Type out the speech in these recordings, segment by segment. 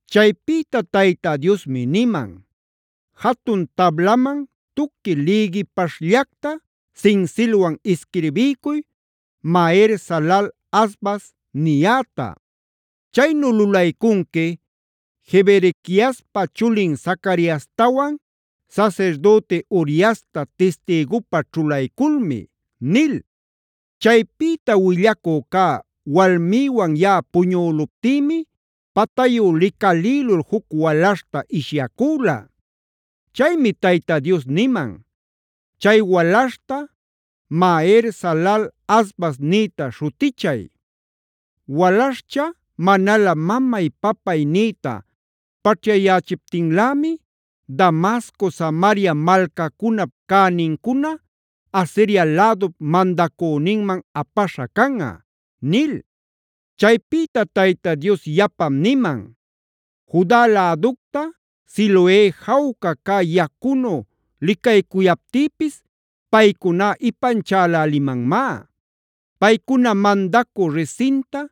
Chaypïta Tayta Diosmi niman: “Jatun tablaman tuqui lïgipaśhllacta sinsilwan isquirbiycuy ‘Maher-salal-hasbaz’a niyäta. Chaynu lulaycunqui Jeberequiaspa chulin Zacariastawan sasirdüti Uriastab tistïgupä ćhulayculmi” nil. Chaypïta willacü cä walmïwan yaꞌa puñüluptïmi patayu licalïlul juc walaśhta ishyacüla. Chaymi Tayta Dios niman: “Chay walaśhta Maher-salal-hasbaz nïta śhutichay. Walaśhcha manalä ‘mamay’ ‘papay’ nïta paćhyayächiptinlämi Damasco, Samaria malcacunap cänincuna, Asiria lädup mandacüninman apaśha canꞌa” nil. Chaypïta Tayta Dios yapam niman: “Juda läducta, Siloe jawca cä yacunu licaycuyaptïpis paycuná ipanchälälimanmá. Paycuna mandacü Rezinta,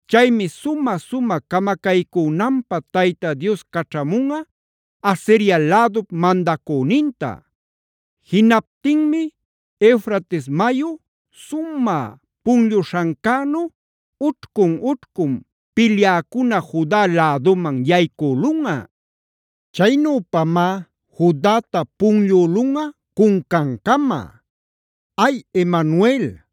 Chaymi sumä-sumä camacaycünanpä Tayta Dios caćhamunꞌa Asiria lädup mandacüninta. Jinaptinmi Eufrates mayu sumä punlluśhancänu ućhcun-ućhcun pilyäcuna Juda läduman yaycülunꞌa. Chaynüpamá Judata punllülunꞌa cuncancama. ¡Ay Emanuel,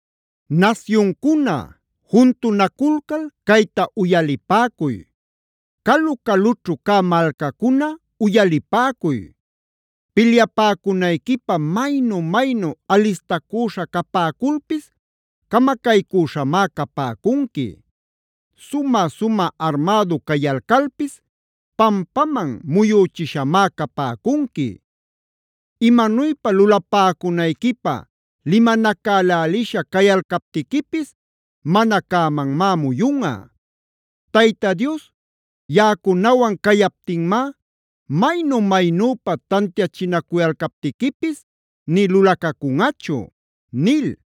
“Nasyuncuna, juntunaculcal cayta uyalipäcuy; calu-calućhu cä malcacuna uyalipäcuy. Pilyapäcunayquipä maynu-maynu alistacüśha capäculpis camacaycüśhamá capäcunqui. Sumä-sumä armädu cayalcalpis pampaman muyüchishamá capäcunqui. Imanuypa lulapäcunayquipä limanacälälisha cayalcaptiquipis mana cämanmá muyunꞌa. Tayta Dios yaꞌacunawan cayaptinmá, maynu-maynüpa tantiachinacuyalcaptiquipis nï lulacacunꞌachu” nil.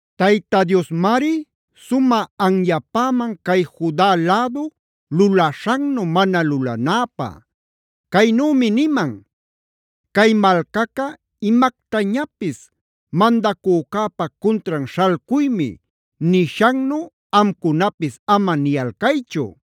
Tayta Diosmari sumä anyapäman cay Juda lädu lulaśhannu mana lulanäpä. Caynümi niman: “Cay malcaca imactañapis ‘Mandacücäpa cuntran śhalcuymi’ nishannu amcunapis ama niyalcaychu.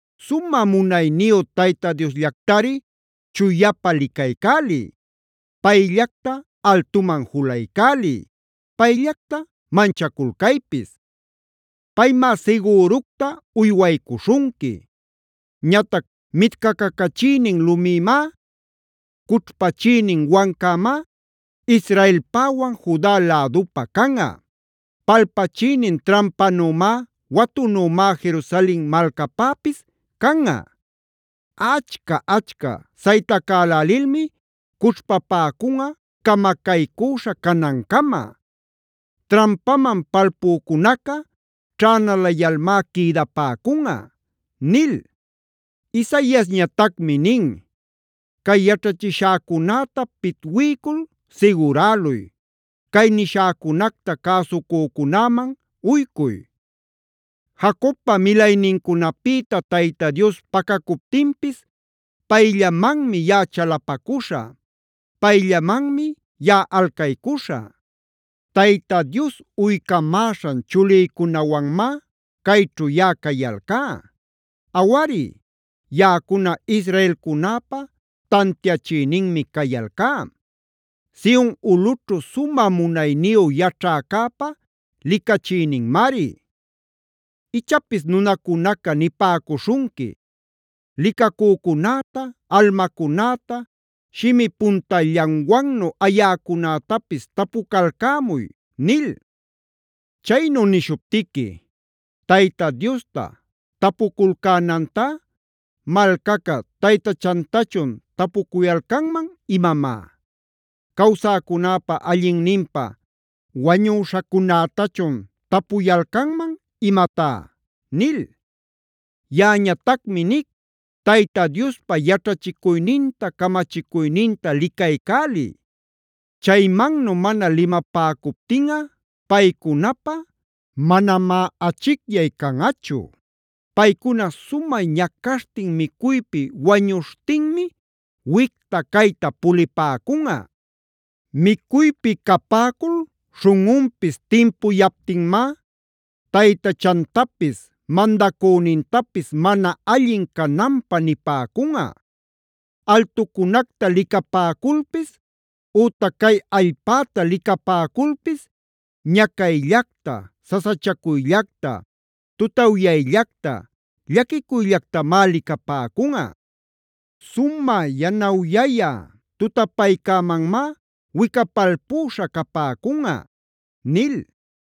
Sumä munayniyu Tayta Diosllactari chuyapa licaycäliy. Payllacta altuman julaycäliy; payllacta manchaculcaypis. Paymá sigüructaf uywaycuśhunqui. Ñatac mitcacacachïnin lumimá, cućhpachïnin wancamá Israelpäwan Juda lädupä canꞌa. Palpachïnin trampanümá, watunümá Jerusalen malcapäpis canꞌa. Achca-achca saytacälälilmi cućhpapäcunꞌa camacaycüśha canancama; trampaman palpücunaca ćhänalayalmá quïdapäcunꞌa” nil. Isaiasñatacmi nin: “Cay yaćhachishäcunäta pitwiycul siguräluy; cay nishäcunacta cäsucücunäman uycuy. “Jacobpa milaynincunapïta Tayta Dios pacacuptinpis, payllamanmi yaꞌa chalapacuśhä; payllamanmi yaꞌa alcaycuśhä. Tayta Dios uycamäśhan chulïcunawanmá cayćhu yaꞌa cayalcá. Awari, yaꞌacuna israelcunäpä tantiachïninmi cayalcá; Sion ulꞌućhu sumä munayniyu yaćhäcäpa licachïninmari. Ichapis nunacunaca nipäcuśhunqui: ‘Licacücunäta, almacunäta shimi puntallanwannu ayäcunätapis tapucalcämuy’ nil. Chaynu nishuptiqui:g ‘¿Tayta Diosta tapuculcänantá malcaca taytachantachun tapucuyalcanman imamá? ¿Cawsäcunäpa allinninpä wañüśhacunätachun tapuyalcanman imatá?’ nil. Yaꞌañatacmi nic, Tayta Diospa yaćhachicuyninta camachicuyninta licaycäliy. Chaymannu mana limapäcuptinꞌa paycunapä manamá achicyay canꞌachu. “Paycuna sumä ñacaśhtin micuypi wañuśhtinmi wicta-cayta pulipäcunꞌa. Micuypi capäcul śhunꞌunpis timpuyaptinmá, taytachantapis, mandacünintapis mana allin cananpä nipäcunꞌa. Altucunacta licapäculpis, ütac cay allpäta licapäculpis ñacayllacta, sasachacuyllacta, tutawyayllacta, llaquicuyllactamá licapäcunꞌa. Sumä yanawyaya tutapaycämanmá wicapalpüśha capäcunꞌa” nil.